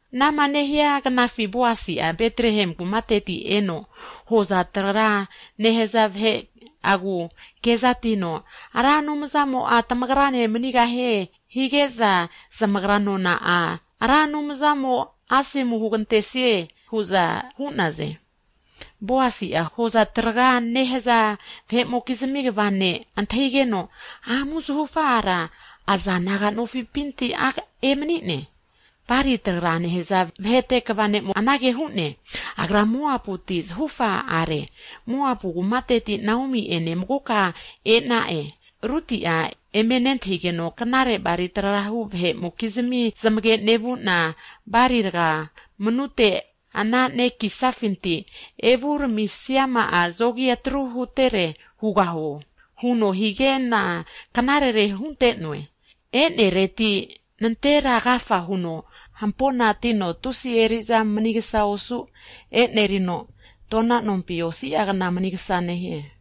Anama nehia knafi Boasi'a Betlehem kumateti eno, hoza traga nehaza vahe'agu kezatino Ra Anumzamo'a tamagrane manigahie, hige'za zamagra nona'a, Ra Anumzamo'a asomu hugantesie, hu'za hu'naze. Boasi'a, hoza traga nehaza vahe'mokizmi kva ne' antahigeno, Amu zahufa ara aza naga nofipinti a' emani'ne? Hagi bali traga nehaza vahe'te kva ne'mo anage hu'ne, Agra Moabuti zahufa are, Moabu kumateti Naomi'ene magoka ena'e. Ruti'a eme nantahigeno, Knare bali tragahu vahe'mokizmi zamage nevu'na, bali raga ko'nama ananekisafinti evu ramisiama'a zogi atru hutere hugaho? Huno hige'na, knarere hunte'noe. E'neregati nantera agafa huno hamponatino tusi eri'za manigsa osu enerino, tona nompina osi'a kna manigsa hu'ne.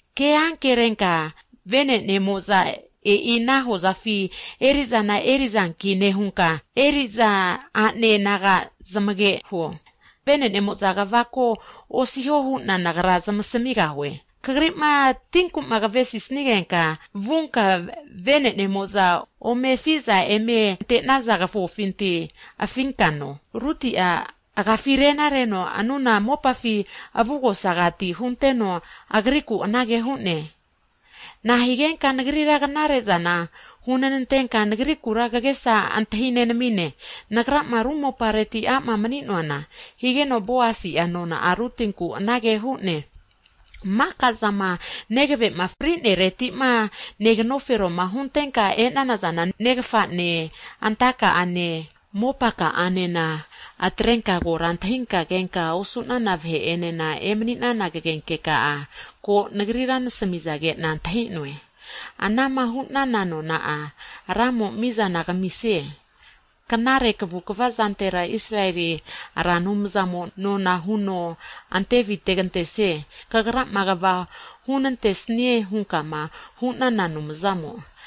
Ke ankerenka vene'nemo'za e'ina hozafi eri'zana eri'zanki nehunka, eri'za a'ne naga zamage huo. Vene'nemo'za kvako osiho hu'na nagra zamasmigahue. Kagri'ma tinku kavesisnigenka, vunka vene'nemo'za ome afi'za eme ante'naza kavofinti afinka no. Ruti'a agiafi rena reno avugosa mopafi hunteno, agrikura anage hu'ne, Nahigenka nagrira knare'zana hunantenka, nagrikura kagesa antahi nenamine, nagrama ru mopareti a'ma mani'noana? Higeno, Boasi'a nona'a Rutinku anage hu'ne, Maka'zama negave'ma fri'nereti'ma negnoferoma huntenka e'nana'zane, negafane, anta'kane, mopaka'anema atretenka kora antahinka, kenka osu'nana vahe'enena emani'nana kagenke ka'a ko nagrira nasmige'na antahi'noe. Anama hu'nana nona'a, Ramo mizana kamisie. Knare kvukva zantera Israeli Ra Anumzamo nona huno ante avitegantesie, kagrama kva hunante'snie, hunkama hu'nana Anumzamo asomu hugantesie.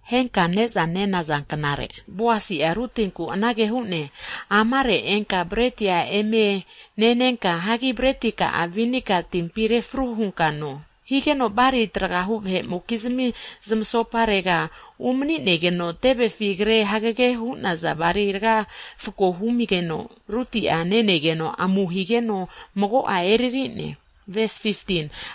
Henka ne'za nenaza knare, Boasi'a Rutinku anage hu'ne, Amare enka breti eme nenenka, hagi breti ka'a vinega timpi refru hunka no! Higeno bali tragahu vahe'mokizmi zamasoparega umani'negeno tevefi kre hagege hu'naza bali raga refko humigeno Ruti'a neteno amu higeno mago'a eriri'ne.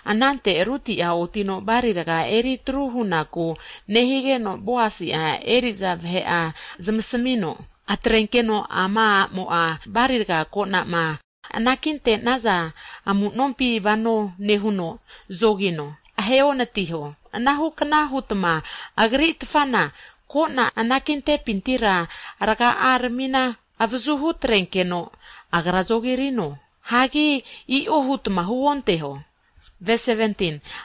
Anante Ruti'a otino bali raga eri atru hunaku nevigeno, Boasi'a eri'za vahe'a zamasmino, Atrenkeno ama a'mo'a bali raga ko'na'ma anakinte'naza amu'nompi vano nehuno zoneginigeta ahe onatiho. Anahu kna hutma agri tfana, ko'na anakintepintira raga'a rmina avazuhu atre'nenkeno agra zogirino, hagi i'o hutma huonteho.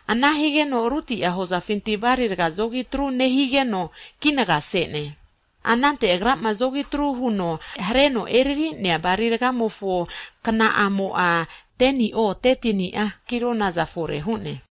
Ana higeno Ruti'a hozafinti bali raga zogi atru nehigeno vuno kinaga se'ne. Anante agrama zogi atru huno hareno eriri'nea bali rgamofo kna'amo'a 10ni'o, 13ni'a kilo naza fore hu'ne.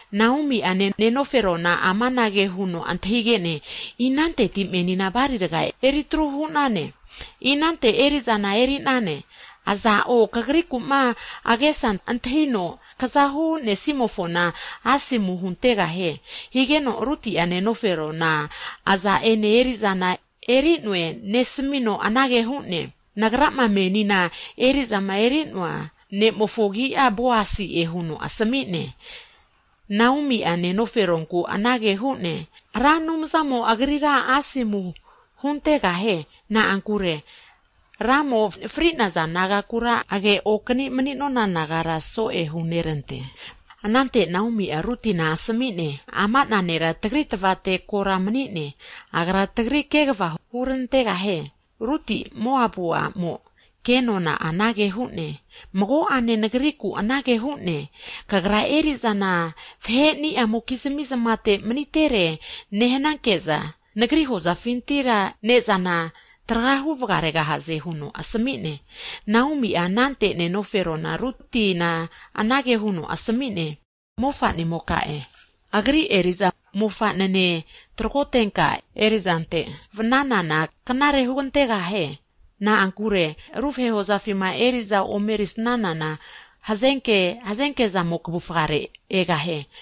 Naomi'a, nenoferona amanage huno antahige'ne, Inante menina bali raga eritru hu'nane? Iza hozafi eri'zana eri'nane? Aza'o kagriku'ma agesa antahino kza hu'nesimofona asomu huntegahie. Higeno Ruti'a nenoferona aza'ene eri'zana eri'neo, nesmino anage hu'ne, Nagrama menima eri'zama erinte'noa ne'mofo agi'a, Boasi'e huno asmi'ne. Naomi'a nenoferonku anage hu'ne, Ra Anumzamo'a agrira asomu huntegahie. Na'ankure Ramo fri'naza nagakura age okanino, mani'nona nagara so'e hunerante. Anante Naomi'a, Rutina asmi'ne, Ama'na nera tagri tvate kora mani'neankino, agra tagri kegava hurantegahie. Ruti, Moapu a'mo ke nona'a anage hu'ne, Mago'ane nagriku anage hu'ne, Kagra eri'za vaheni'a mokizmi zamate manitere nehnanke'za nagri hozafinti ne'zana tragahu vagaregahaze huno nasmi'ne. Naomi'a, anante nenofero Rutina anage huno asmi'ne, Mofa'nimoka agri eri'za mofa'nene tragotenka eri'zante vnanana knare hugantegahie. Na'ankure ru vahe hozafi'ma eri'za omerisanana, hazenkezamo kvufare egahie.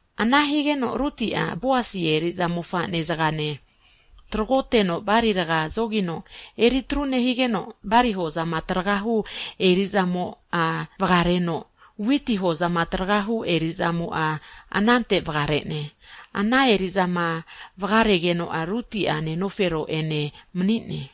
Ana higeno Ruti'a, Boasi eri'za mofane zagane tragoteno bali raga zogino eritru nehigeno, bali hozama tragahu eri'zamo'a vagaregeno, witi hozama tragahu eri'zamo'enena anante vagare'ne. Ana eri'zama vagaregeno'a Ruti'a nenofero'ene mani'ne.